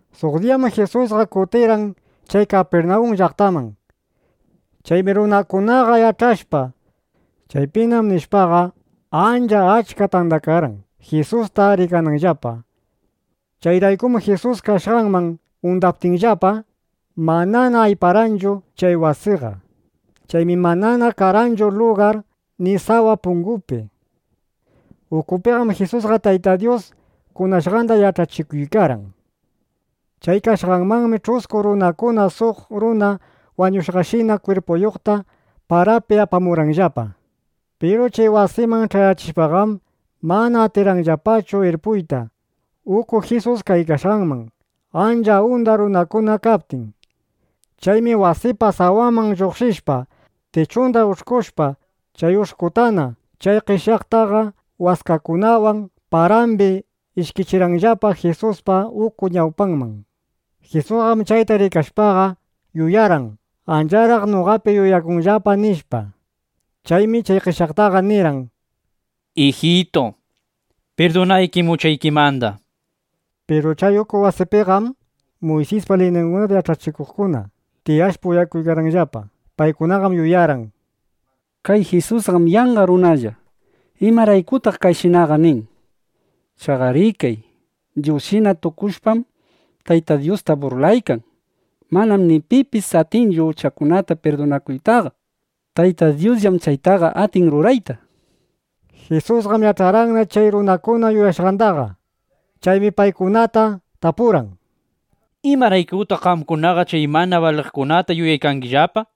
Suq diyam Jisusqa kutirirqan chay Kapirnawun llaqtaman. Chaymi runakunaqa yach'ashpa: Chaypinam, nishpaqa, ancha achka tandakarqan, Jisusta rikananllapa. Chayraykum Jisus kashqanman undaptinllapa, manana ayparqanchu chay wasiqa. Chaymi manana karqanchu lugar ni sawa pungupi. Ukupiqam Jisusqa Tayta Dyus kunashqanda yach'achikuykarqan. Chay kashqanmanmi ch'usku runakuna suq runa wañushqashina kwirpuyuqta parapi apamurqanllapa. Piru chay wasiman ch'ayachishpaqam, mana atirqanllapachu irpuyta uku Jisus kashqanman, ancha unda runakuna kaptin. Chaymi wasipa sawanman lluqshishpa, tichunda ush'kushpa, chay ush'kutana chay qeshyaqtaqa waskakunawan parambi ishkichirqanllapa Jisuspa uku ñawpanman. Jisusqam chayta rikashpaqa, yuyarqan: Ancharaq noqapi yuyakunllapa, nishpa. Chaymi chay qeshyaqtaqa nirqan: —Ijitu, pirdunaykim uchaykikunamanda, nishpa. Piru chay uku wasipiqam Muysispa liyningunata yach'achikuqkuna tiyashpa, uyakuykarqanllapa. Paykunaqam yuyarqan: Kay Jisusqam yanqa runalla. ¿Imaraykutaq kayshinaqa nin? ¡Chaqa rikay! Dyusshina tukushpam, Tayta Dyusta burlaykan. Manam ni pipis atinchu uchakunata pirdunakuytaqa. Tayta Dyusllam chaytaqa atin rurayta, nishpa. Jisusqam yach'arqanna chay runakuna yuyashqandaqa. Chaymi paykunata tapurqan: —¿Imaraykutaq qamkunaqa chay mana baliqkunata yuyaykangillapa?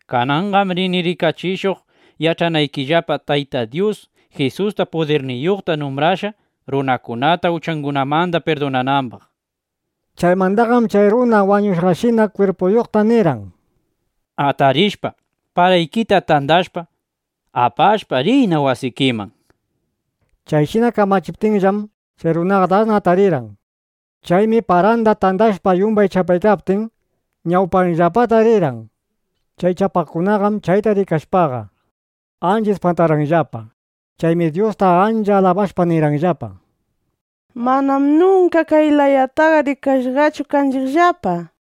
Kananqam rini rikachishuq yach'anaykillapa: Tayta Dyus Jisusta pudirniyuqta numbrashqa, runakunata uchangunamanda pirdunanambaq, nishpa. Chaymandaqam, chay runa wañushqashina kwirpuyuqta nirqan: —Atarishpa, paraykita tandashpa, apashpa, riyna wasikiman, nishpa. Chayshina kamachiptinllam, chay runaqa dasna atarirqan. Chaymi paranda tandashpa, yumbay chapaykaptin, ñawpanllapata rirqan. Chay chapaqkunaqam chayta rikashpaqa, ancha ispantarqanllapa. Chaymi Dyusta ancha alabashpa nirqanllapa: —¡Manam nunka kay layataqa rikashqachu kanchiqllapa! nishpa.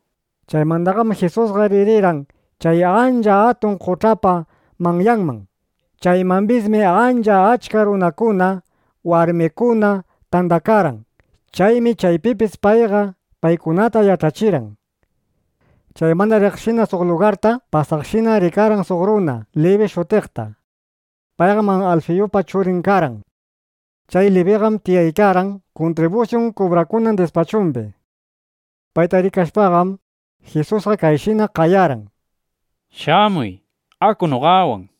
Chaymandaqam Jisusqa ririrqan chay ancha atun qoch'apa manyanman. Chaymambismi ancha achka runakuna, warmikuna tandakarqan. Chaymi chaypipis payqa paykunata yach'achirqan. Chaymanda riqshina suq lugarta pasaqshinam rikarqan suq runa Libi shutiqta. [Nuta: Chay Libillam Matiyupis shutiq.] Payqam Alfiyupa churin karqan. Chay Libiqam tiyaykarqan kuntribusyun kubrakunan dispachumbi. Payta rikashpaqam, Jisusqa kayshina qayarqan: —Shamuy, aku noqawan, nishpa.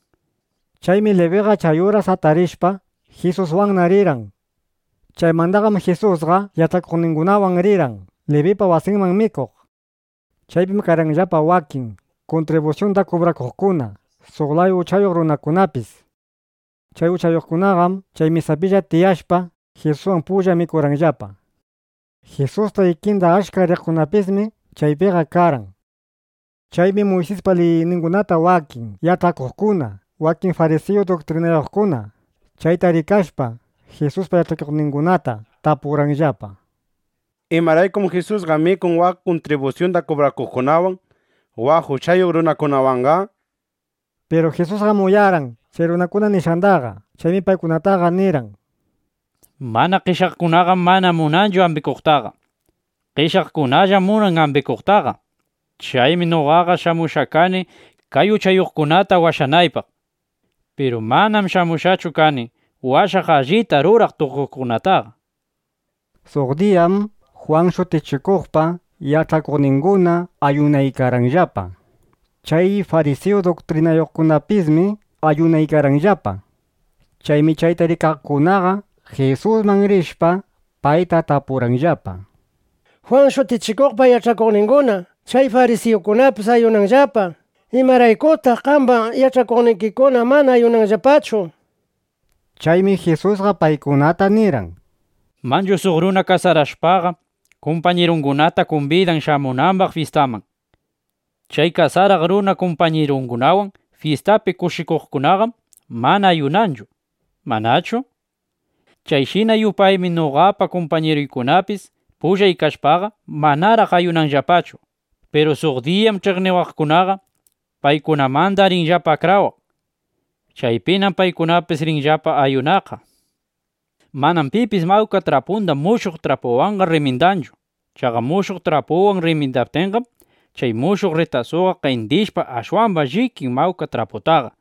Chaymi Libiqa chay uras atarishpa, Jisuswanna rirqan. Chaymandaqam Jisusqa yach'akuqningunawan rirqan Libipa wasinman mikuq. Chaypim karqanllapa wakin kuntribusyunda kubrakuqkuna, suq laya uchayuq runakunapis. Chay uchayuqkunaqam chay mesapilla tiyashpa, Jisuswan pulla mikuykarqanllapa. Jisuspa ikinda achka riqkunapismi chaypiqa karqan. Chaymi Muysispa liyningunata wakin yach'achikuqkuna, wakin farisiyu duktrinayuqkunaqa chayta rikashpa, Jisuspa yach'akuqningunata tapurqanllapa: —¿Imaraykum Jisusqa mikun waq kuntribusyunda kubrakuqkunawan, waq uchayuq runakunawanqa? nishpa. Piru Jisusqam uyarqan chay runakuna nishqandaqa. Chaymi paykunataqa nirqan: —Mana qeshyaqkunaqam mana munanchu ambikuqtaqa. Qeshyaqkunallam munan ambikuqtaqa. Chaymi noqaqa shamushqa kani kay uchayuqkunata washanaypaq. (Chayraykum paykunawan kani.) Piru manam shamushqachu kani washaq allita ruraq tukuqkunataqa, nishpa. Suq diyam Jwan Shutichikuqpa yach'akuqninguna, ayunaykarqanllapa. Chay farisiyu duktrinayuqkunapismi ayunaykarqanllapa. Chaymi chayta rikaqkunaqa Jisusman rishpa, payta tapurqanllapa: —Jwan Shutichikuqpa yach'akuqninguna, chay farisiyukunapis ayunanllapa. ¿Imaraykutaq qamba yach'akuqnikikuna mana ayunanllapachu? nishpa. Chaymi Jisusqa paykunata nirqan: —Manchu suq runa kasarashpaqa, kumpañirungunata kumbidan shamunambaq fyistanman. Chay kasaraq runa kumpañirungunawan fyistapi kushikuqkunaqam mana ayunanchu, ¿manachu? Chayshina yupaymi noqapa kumpañiruykunapis pullay kashpaqa, manaraq ayunanllapachu. Piru suq diyam (ch'iqniwaqkunaqa) paykunamanda rinllapa akrawaq. Chaypinam paykunapis rinllapa ayunaqqa. ’Manam pipis mawka trapunda mushuq trapuwanqa rrimindanchu. Chaqa mushuq trapuwan rrimindaptinqam, chay mushuq rritasuqa qendishpa, ashwamba llikin mawka traputaqa.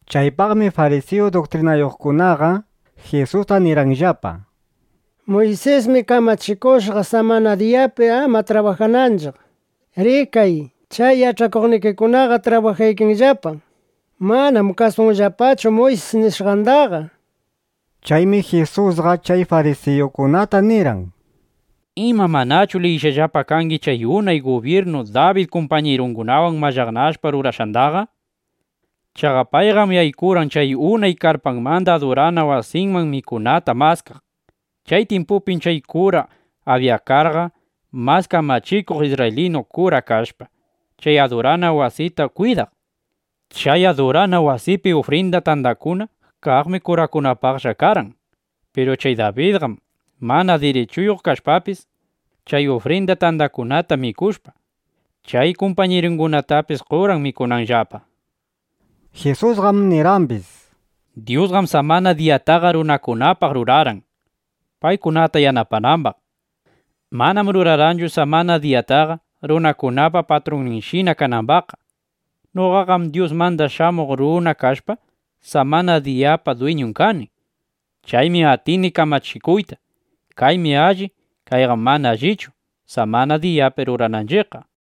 Chaypaqmi farisiyu duktrinayuqkunaqa Jisusta nirqanllapa: —Muysismi kamachikushqa, samana diyapi ama trabajananchiq. ¡Rikay! Chay yach'akuqnikikunaqa trabajaykanllapa. Manam kasunllapachu Muysis nishqandaqa, nishpa. Chaymi Jisusqa chay farisiyukunata nirqan: —¿Ima, manachu liyishqallapa kangi chay unay gubyirnu Dabid kumpañirungunawan mallaqnashpa rurashqandaqa? Chaqa payqam yaykurqan chay unay karpamanda adurana wasiman mikunata maskaq. Chay tyimpupim chay kura Abyatarqa mas kamachikuq isrraylinu kura kashpa, chay adurana wasita kwidaq. Chay adurana wasipi ufrinda tandakuna kaqmi kurakunapaqlla karqan. Piru chay Dabidqam mana dirichuyuq kashpapis, chay ufrinda tandakunata mikushpa, chay kumpañirungunatapis qorqan mikunambaqllapa. Jisusqam nirqambis: —Dyusqam samana diyataqa runakunapaq rurarqan, paykunata yanapanambaq. Manam rurarqanchu samana diyataqa, runakunapa patrunninshina kanambaqqa. Noqaqam Dyusmanda Shamuq Runa kashpa, samana diyapa dwiñun kani. Chaymi atini kamachikuyta: Kaymi alli ichu kayqam mana allichu, samana diyapi rurananchiqqa, nishpa.